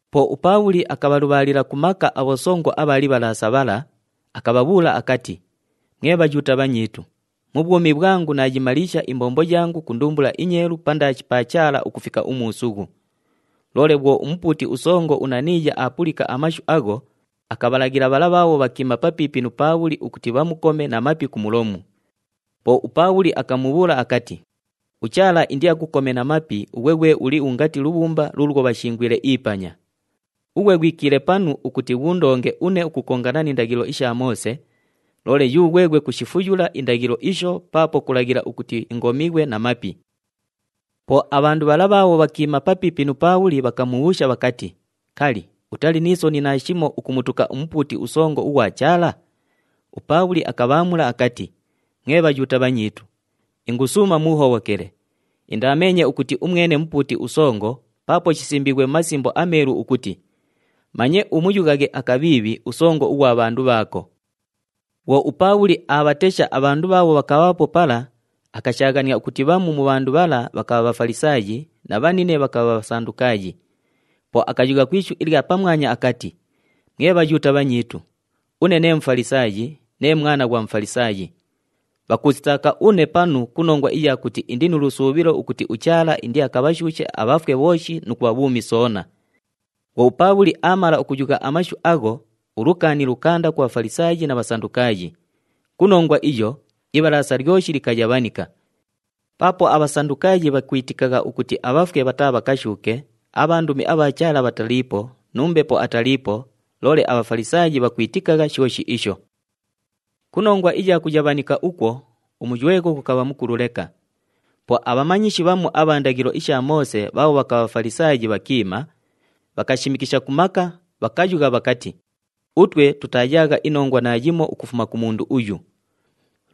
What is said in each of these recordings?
Po uPaabhuli akabhalubhaalila ku maka abhosongo abha Libhalaasa bhala, akabhabhuula akati, “Mwe Bhayuuta bhanyiitu, mu bhwumi bhwangu naayimaliisha imbombo yangu ku ndumbula inyeelu pandaashi pa Chaala ukufika umuusughu.” Loole bhwo umupuuti usongo uNaniiya aapulika amashu agho, akabhalaghila bhala bhaabho bhakiima papiipi nu Paabhuli ukuti bhamukome na mapi ku mulomu. Po uPaabhuli akamubhuula akati, “UChaala indiakukome na mapi ughwe ghwe uli ungati lubhumba luulwo bhashingwile ipanya! Ughwe ghwikiile panu ukuti ghuundonge une ukukongana ni ndaghilo isha Moose, loole yughweghwe kushifuyula indaghilo isho paapo kulaghila ukuti ingomighwe na mapi!” Po abhandu bhala bhaabho bhakiima papiipi nu Paabhuli bhakamubhuusha bhakati, “Kali, utali ni soni naashimo ukumutuka umupuuti usongo ughwa Chaala?” UPaabhuli akabhaamula akati, “Mwe Bhayuuta bhanyiitu, ingusuuma muuhobhokele, indaameenye ukuti umwene mupuuti usongo paapo shisimbiighwe mu Masimbo aMeelu ukuti, ‘Manye umuyughaghe akabhiibhi usongo ughwa bhandu bhaako.’” Bhwo uPaabhuli aabhatesha abhandu bhaabho bhakabhaapo pala, akashaaghania ukuti bhamu mu bhandu bhala bhakabha Bhafalisaayi na bhanine bhakabha Bhasandukaayi. Po akayugha ku ishu ilya pamwanya akati, “Mwe Bhayuuta bhanyiitu, une nee Mufalisaayi, nee mwana ghwa Mufalisaayi. Bhakuusitaaka une panu ku nongwa iya kuti indi nu lusuubhilo ukuti uChaala indiakabhashuushe abhafwe bhooshi nu kubha bhuumi soona.” Bhwo uPaabhuli aamala ukuyugha amashu agho, ulukaani lukaanda ku Bhafalisaayi na Bhasandukaayi. Ku nongwa iyo, Ibhalaasa lyoshi likayabhanika. Paapo aBhasandukaayi bhakwitikagha ukuti abhafwe bhataabhakashuuke, abhandumi abha Chaala bhataliipo, nu mbepo ataliipo, loole aBhafalisaayi bhakwitikagha shooshi isho. Ku nongwa iya kuyabhanika ukwo, umuywegho ghukabha mukulu leka. Po abhamanyishi bhamu abha ndaghilo isha Moose bhaabho bhakabha Bhafalisaayi bhakiima, bhakashimikisha ku maka, bhakayugha bhakati, “Utwe tutaayaagha inongwa naayimo ukufuma ku mundu uyu!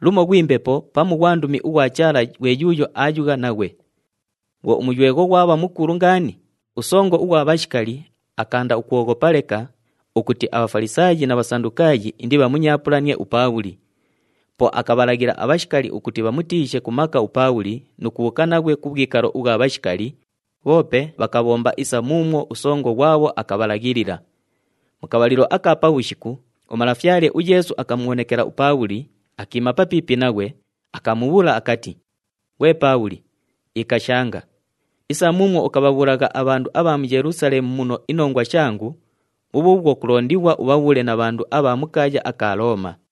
Lumo ghwi mbepo pamu ghwandumi ughwa Chaala ghwe yuuyo aayugha naghwe.” Bhwo umuywegho ghwabha mukulu ngaani, usongo ughwa bhashikali akaanda ukwoghopa leka ukuti aBhafalisaayi na Bhasandukaayi indibhamunyaapulanie uPaabhuli. Po akabhalaghila abhashikali ukuti bhamutiishe ku maka uPaabhuli nu kubhuuka naghwe ku bhwikalo ubhwa bhashikali, bhoope bhakabhomba isa muumwo usongo ghwabho akabhalaghilila. Mu kabhalilo aka pabhushiku, uMalafyale uYeesu akamubhonekela uPaabhuli, akiima papiipi naghwe, akamubhuula akati, “Ghwe Paabhuli, ikashanga! Isa muumwo ukabhabhuulagha abhandu abha mu Yelusaleemu muno inongwa shangu, bhubhuubhwo kulondighwa ubhabhuule na bhandu abha mu kaaya aka Looma.”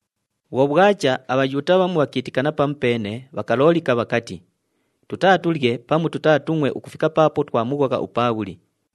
Bhwo bhwacha, aBhayuuta bhamu bhakiitikana pamupeene, bhakaloolika bhakati, “Tutaatulye pamu tutaatungʼwe ukufika paapo twamughogha uPaabhuli.”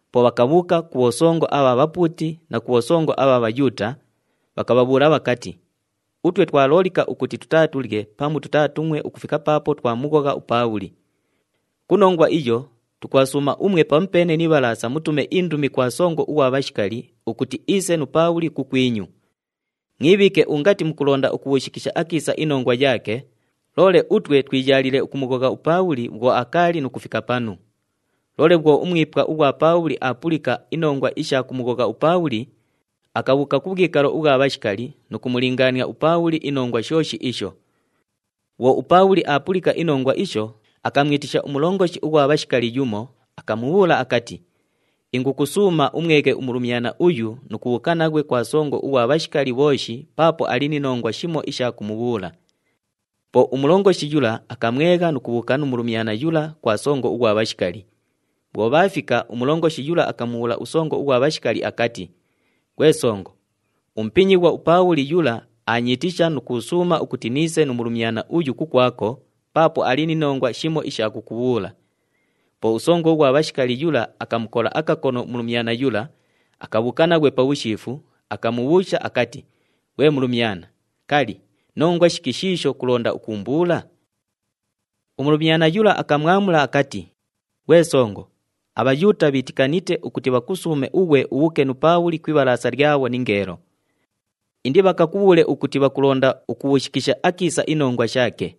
Po bhakabhuuka ku bhosongo abha bhapuuti na ku bhosongo abha Bhayuuta, bhakabhabhuula bhakati, “Utwe twaloolika ukuti tutaatulye pamu tutaatungʼwe ukufika paapo twamughogha uPaabhuli. Ku nongwa iyo, tukubhasuuma umwe pamupeene ni Ibhalaasa mutume indumi kwa songo ughwa bhashikali ukuti iise nu Paabhuli kukwinyu. Mwibhiike ungati mukulonda ukubhuushikisha akiisa inongwa yaake, loole utwe twiyaaliile ukumughogha uPaabhuli bhwo akaali nu kufika panu.” Loole bhwo umwipwa ughwa Paabhuli aapulika inongwa isha kumughogha uPaabhuli, akabhuuka ku bhwikalo ubhwa bhashikali nu kumulingaania uPaabhuli inongwa shooshi isho. Bhwo uPaabhuli aapulika inongwa isho, akamwitisha umulongoshi ughwa bhashikali yumo, akamubhuula akati, “Ingukusuuma umweghe umulumyana uyu nu kubhuuka naghwe kwa songo ughwa bhashikali bhooshi paapo ali ni nongwa shimo isha kumubhuula.” Po umulongoshi yula akamwegha nu kubhuuka nu mulumyana yula kwa songo ughwa bhashikali. Bhwo bhaafika, umulongoshi yula akamubhuula usongo ughwa bhashikali akati, “Ghwe songo, umupinyighwa uPaabhuli yula aanyiitisha nu kuusuuma ukuti niise nu mulumyana uyu kukwako paapo ali ni nongwa shimo isha kukubhuula.” Po usongo ughwa bhashikali yula akamukola akakono umulumyana yula, akabhuuka naghwe pabhushiifu, akamubhuusha akati, “Ghwe mulumyana, kali, nongwa shiki shiisho kulonda ukuumbuula?” Umulumyana yula akamwamula akati, “Ghwe songo, aBhayuuta bhiitikanite ukuti bhakusuume ughwe ubhuuke nu Paabhuli ku Ibhalaasa lyabho ningeelo. Indibhakakubhuule ukuti bhakulonda ukubhuushikisha akiisa inongwa shaake.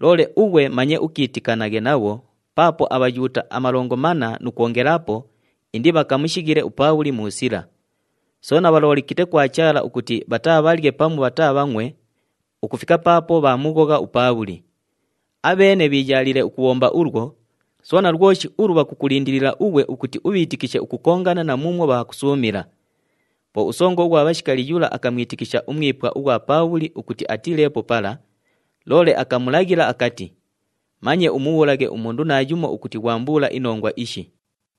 Loole ughwe manye ukiitikanaghe nabho paapo aBhayuuta amalongo manna nu kwongelaapo indibhakamushighile uPaabhuli mu sila. Soona bhaloolikite kwa Chaala ukuti bhataabhalye pamu bhataabhangʼwe ukufika paapo bhaamughogha uPaabhuli. Abheene bhiiyaaliile ukubhomba ulwo, soona lwoshi ulu bhakukulindilila ughwe ukuti ubhiitikishe ukukongana na muumwo bhaakusuumila.” Po usongo ughwa bhashikali yula akamwitikisha umwipwa ughwa Paabhuli ukuti atiileepo pala, loole akamulaghilila akati, “Manye umubhuulaghe umundu naayumo ukuti ghwambuula inongwa ishi.”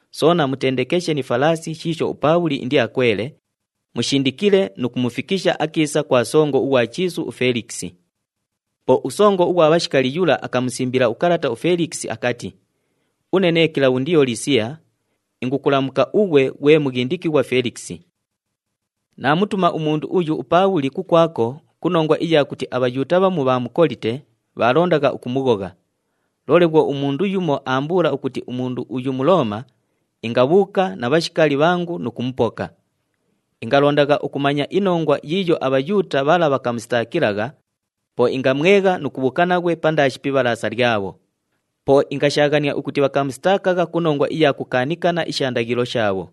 Soona mutendekeshe ni falaasi shiisho uPaabhuli indiakwele, mushindikile nu kumufikisha akiisa kwa songo ughwa chiisu uFelikisi.” Po usongo ughwa bhashikali yula akamusimbila ukalata uFelikisi akati, “Une nee Kilabhundiyo Lisiya, ingukulamuka ughwe ghwe mughindikighwa Felikisi. “Naamutuma umundu uyu, uPaabhuli, kukwako ku nongwa iya kuti aBhayuuta bhamu bhaamukolite, bhaalondagha ukumughogha. Loole bhwo umundu yumo aambuula ukuti umundu uyu Mulooma, ingabhuuka na bhashikali bhangu nu kumupoka. Ingalondagha ukumanya inongwa yiiyo aBhayuuta bhala bhakamusitaakilagha, po ingamwegha nu kubhuuka naghwe pandaashi pi ibhalaasa lyabho. Po ingashaaghania ukuti bhakamusitaakagha ku nongwa iya kukaanikana isha ndaghilo shaabho.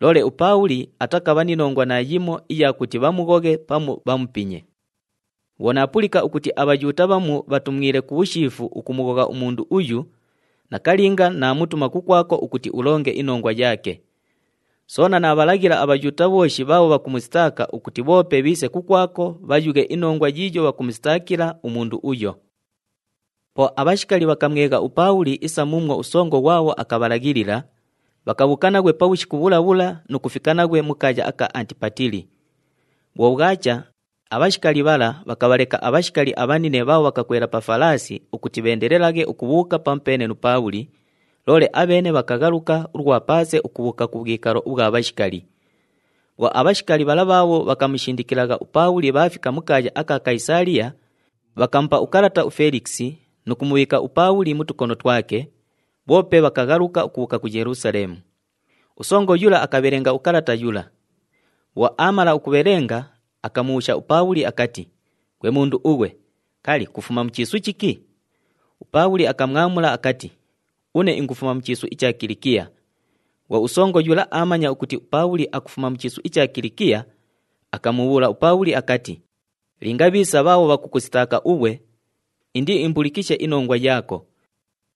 Loole uPaabhuli atakabha ni nongwa naayimo iya kuti bhamughoghe pamu bhamupinye. Bhwo naapulika ukuti aBhayuuta bhamu bhatumwile ku bhushiifu ukumughogha umundu uyu, nakalinga naamutuma kukwako ukuti ulonge inongwa yaake. Soona naabhalaghila aBhayuuta bhooshi bhaabho bhakumusitaaka ukuti bhoope bhiise kukwako bhayughe inongwa yiiyo bhakumusitaakila umundu uyo.” Po abhashikali bhakamwegha uPaabhuli isa muumwo usongo ghwabho akabhalaghilila, bhakabhuuka naghwe pabhushiku bhula bhula nu kufika naghwe mu kaaya aka Antipatili. Bhwo bhwacha, abhashikali bhala bhakabhaleka abhashikali abhanine bhaabho bhakakwela pa falaasi ukuti bheendelelaghe ukubhuuka pamupeene nu Paabhuli, loole abheene bhakaghaluka ulwa paase ukubhuuka ku bhwikalo ubhwa bhashikali. Bhwo abhashikali bhala bhaabho bhakamushindikilagha uPaabhuli bhaafika mu kaaya aka Kayisaaliya, bhakamupa ukalata uFelikisi nu kumubhiika uPaabhuli mu tukono twake, bhoope bhakaghaluka ukubhuuka ku Yelusaleemu. Usongo yula akabhelenga ukalata yula. Bhwo aamala ukubhelenga, akamubhuusha uPaabhuli akati, “Ghwe mundu ughwe, kali, kufuma mu chiisu chiki?” UPaabhuli akamwamula akati, “Une ingufuma mu chiisu icha Kilikiya.” Bhwo usongo yula aamanya ukuti uPaabhuli akufuma mu chiisu icha Kilikiya, akamubhuula uPaabhuli akati, “Linga bhiisa bhaabho bhakukusitaaka ughwe, indiimbulikishe inongwa yaako.”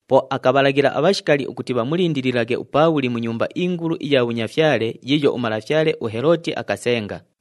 Po akabhalaghila abhashikali ukuti bhamulindililaghe uPaabhuli mu nyumba ingulu iya bhunyafyale yiiyo umalafyale uHelooti akasenga.